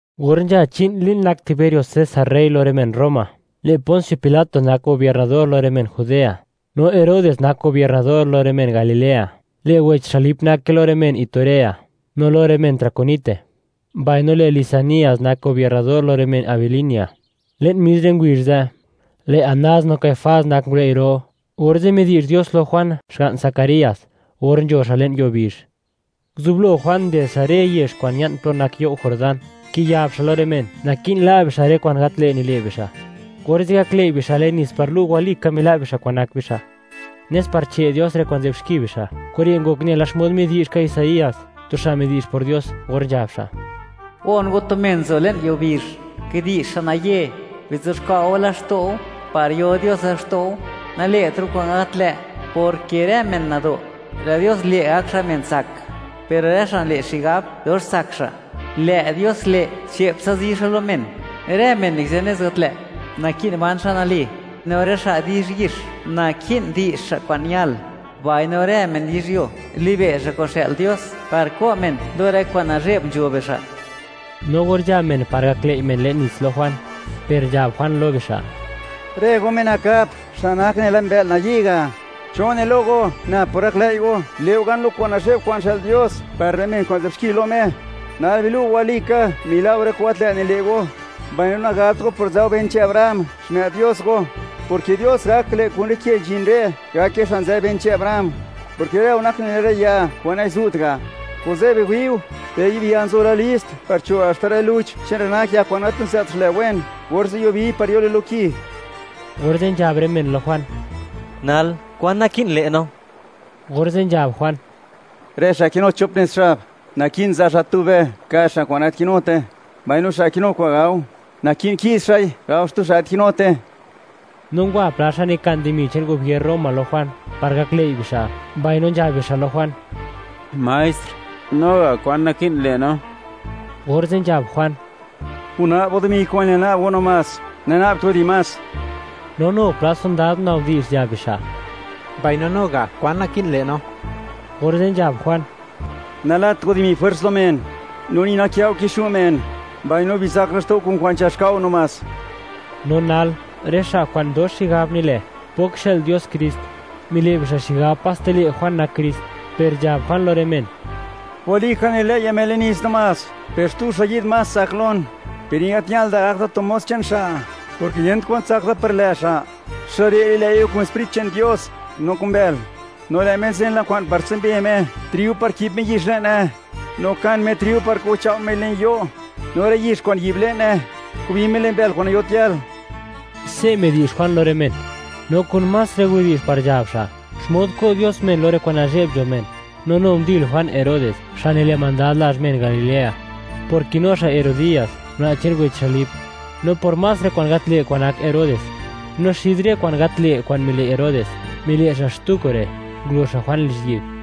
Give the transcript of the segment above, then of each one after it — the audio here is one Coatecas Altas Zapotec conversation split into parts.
Or nzha chi'n li'n nak Tiberio César rey lo rë men Roma, lë' Pons Pilat nak gobiernador lo rë men Judea; no Herodes nak gobiernador lo rë men Galilea; lë' wech xa' Lip nake lo rë men Iturea no lo rë men Traconite; mbaino lë' Lisanias nak gobiernador lo rë men Abilinia. Le'n mis rë ngubizh ze', lë' Anás no Caifás nak ngulëi' ro. Orze' midi'zh Dios lo Juan, xga'n Zacarías or nzho xa' le'n yuo bizh. Nguzublo Juan nded xa' rë yezh kwa'n ña'n plo nak you' Jordán, kiyab xa' lo rë men, naki'n la' bixa' rë kwa'n gat lë' nile' bixa', orze' gaklëi' bixa' le'n nits par lu', walika mila' bixa' kwa'n nak bixa', nes par che' Dios rë kwa'n nzë'b xki bixa'. Kure' ngok nela xmod midi'zh ka Isaías, tu xa' midi'zh por Dios, or nzhab xa': Gon go tu men nzo le'n yuo bizh, kidi'zh xa' naye: “Bizuxkwa' go laxto' go par yo Dios laxto' go, nale'tra' go kwa'n gat lë', porke rë men nado', lë' Dios le' gak xa' men tsak, per rë xa' nile' xigab dox tsak xa', lë' Dios le', che'ptsa zi xa' lo men. Rë men nikizë nez gat lë', naki'n ban xa' nali, no rë xa' di'zhyix, naki'n di'zh xa' kwa'n ñal, mbaino rë men yizhyuo libe' xa' kwa'n xë'l Dios, par ko' men lo rë kwa'n nazhe'b nzho bixa'.” No or nzha men par gaklëi' men le'n nits lo Juan, per nzhab Juan lo bixa': ―¡Rë go, men nakap, xa' nak nela mbë'l nayi' ga'! ¿Cho ne lo go, nab por gaklëi' go, le' go gan lo kwa'n nazhe'b kwa'n xë'l Dios par rë men kwa'n nzë'b xki lo Me? Nal bilu' go walika, mila' go rë kwa'n gat lë' nile' go. Mbaino nagabt go por nzë go ben che'n Abraham, xmë'd Dios go, porke Dios gak le' kun rë ke nzhin re', gake xa' nzë ben che'n Abraham, porke rë go nak nela rë ya kwa'n nazu't ga'. Kuze' biwi'u, lë' yi'b ya nzo la list par cho' haxta rë luch che'n rë nak ya kwa'n gat niza't xlë wen, orze' yubiy par yoi lo ki. Orze' nzhab rë men lo Juan: ―Nal, ¿kwan naki'n le' no? Orze' nzhab Juan: ―Rë xa' kinu chop nez xab, naki'n za' xa' tube ka' xa' kwa'n gat kinute, mbaino xa' kinu kwa'n gao, naki'n ki'z xa'i, gao xtu xa' gat kinute. No ngwa pla xa' nikan dimi che'n gubier Roma lo Juan par gaklëi' bixa', mbaino nzhab bixa' lo Juan: ―Maestr, no ga', ¿kwan naki'n le' no? Orze' nzhab Juan: ―Guna'b go dimi kwa'n ñal na'b go namás, nana'bt goi di más. No nu pla sondad gunabdi'zh, nzhab bixa': ―Mbaino no ga', ¿kwan naki'n le' no? Orze' nzhab Juan: ―Nalat go dimi jwers lo men, no ni nakë' go kixu' men; mbaino bizak laxto' go kun kwa'n nzhax ka' go namás. No nal, rë xa' kwa'n dox xigab nile', pok xë'l Dios Krist; mile' bixa' xigab paste lë' Juan nak Krist, per nzhab Juan lo rë men: ―Walika, nililëi'ya men le'n nits namás, per xtu xa' yi'd más tsak lon. Per ni gat ñal da gak da tu mos che'n xa', porke yent kwan tsak da par lë' xa'. Xa' re' li'lëi' go kun Sprit che'n Dios, no kun bël. No lë' Me nzen la kwa'n par tsumbe Me triu, par ki'b Me yix le'ne. No kan Me triu par kuchao' Mei le'n yo', no lë' yix kwa'n yi'b le'ne, kubi Me le'n bël kwa'n nayot yal. Se' midi'zh Juan lo rë men, no kun más rë widi'zh par nzhab xa' xmod ko' Dios men lo rë kwa'n nazhe'b nzho men. No nu ndil Juan Herodes, xa' nile' mandad lazh men Galilea, por kinu xa' Herodías, una' che'n wech xa' Lip, no por más rë kwa'n gat lë' kwa'n nak Herodes. No xid rë kwa'n gat lë' kwa'n mile' Herodes, mile' xa' xtu kure'; ngulo xa' Juan lizhyi'b.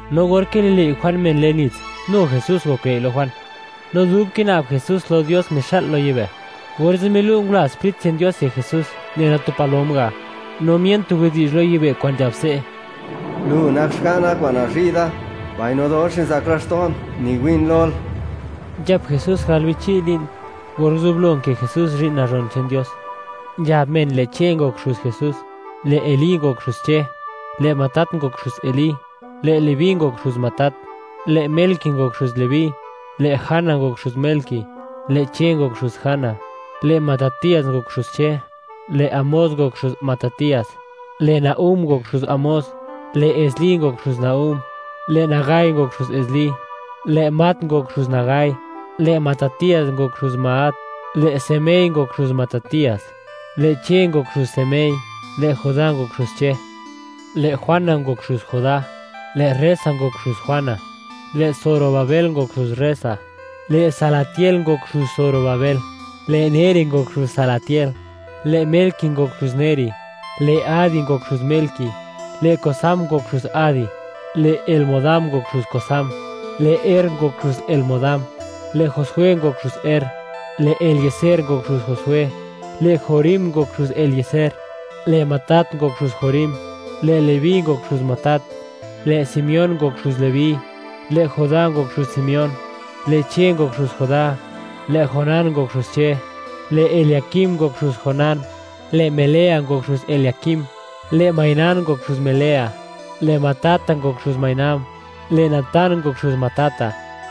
No or kililëi' Juan men le'n nits, nu Jesús ngoklëi' lo Juan; no dub kina'b Jesús lo Dios, mixa'l lo yibë', orze' milu' ngula Sprit che'n Dios yek Jesús nela tu palom ga', no mien tu widi'zh lo yibë' kwa'n nzhab se': ―Lu nak Xga'na, kwa'n nazhi' da; mbaino dox nizak laxto'n, niwi'n lol. Nzhap Jesús gal bichi' li'n or nguzublo nkë Jesús zhi'n nazhon che'n Dios. Nzhab men, lë' Che ngok xuz Jesús, lë' Elí ngok xuz Che. Lë' Matat ngok xuz Elí, lë' Leví ngok xuz Matat, lë' Melqui ngok xuz Leví, lë' Jana ngok xuz Melqui, lë' Che ngok xuz Jana, lë' Matatías ngok xuz Che, lë' Amós ngok xuz Matatías, lë' Nahum ngok xuz Amós, lë' Esli ngok xuz Nahum, lë' Nagai ngok xuz Esli, lë' Maat ngok xuz Nagai, lë' Matatías ngok xuz Maat, lë' Semei ngok xuz Matatías, lë' Che ngok xuz Semei, lë' Judá ngok xuz Che, lë' Joana ngok xuz Judá, lë' Resa ngok xuz Joana, lë' Zorobabel ngok xuz Resa, lë' Salatiel ngok xuz Zorobabel, lë Neri ngok xuz Salatiel, lë' Melqui ngok xuz Neri, lë' Adi ngok xuz Melqui, lë' Cosam ngok xuz Adi, lë' Elmodam ngok xuz Cosam, lë' Er ngok xuz Elmodam, lë' Josué ngok xuz Er, lë' Elieser ngok xuz Josué, lë' Jorim ngok xuz Elieser, lë' Matat ngok xuz Jorim, lë' Leví ngok xuz Matat, lë' Simeón ngok xuz Leví, lë' Judá ngok xuz Simeón, lë' Che ngok xuz Judá, lë' Jonán ngok xuz Che, lë' Eliaquim ngok xuz Jonán, lë' Melea ngok xuz Eliaquim, lë' Mainán ngok xuz Melea, lë' Matata ngok xuz Mainán, lë' Natán ngok xuz Matata.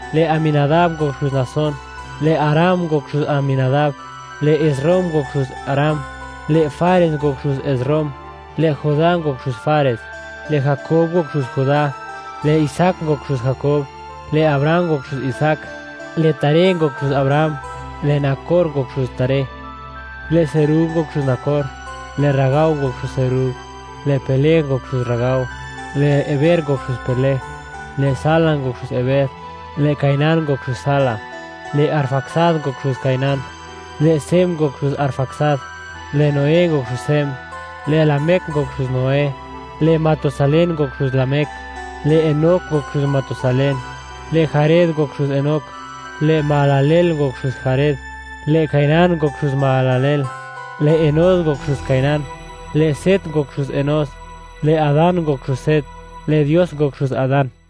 lë' Aminadab ngok xuz Naasón, lë' Aram ngok xuz Aminadab, lë' Esrom ngok xuz Aram, lë' Fares ngok xuz Esrom, lë' Judá ngok xuz Fares, lë' Jakob ngok xuz Judá, lë' Isaac ngok xuz Jakob, lë' Abraham ngok xuz Isaac, lë' Taré ngok xuz Abraham, lë' Nacor ngok xuz Taré, lë' Serug ngok xuz Nacor, lë' Ragao ngok xuz Serug, lë' Peleg ngok xuz Ragao, lë' Heber ngok xuz Peleg, lë' Sala ngok xuz Heber, lë' Cainán ngok xuz Sala, lë' Arfaxad ngok xuz Cainán, lë' Sem ngok xuz Arfaxad, lë' Noé ngok xuz Sem, lë' Lamec ngok xuz Noé, lë' Matusalén ngok xuz Lamec, lë' Enoc ngok xuz Matusalén, lë' Jared ngok xuz Enoc, lë' Mahalaleel ngok xuz Jared, lë' Cainán ngok xuz Mahalaleel, lë' Enós ngok xuz Cainán, lë' Set ngok xuz Enós, lë' Adán ngok xuz Set, lë' Dios ngok xuz Adán.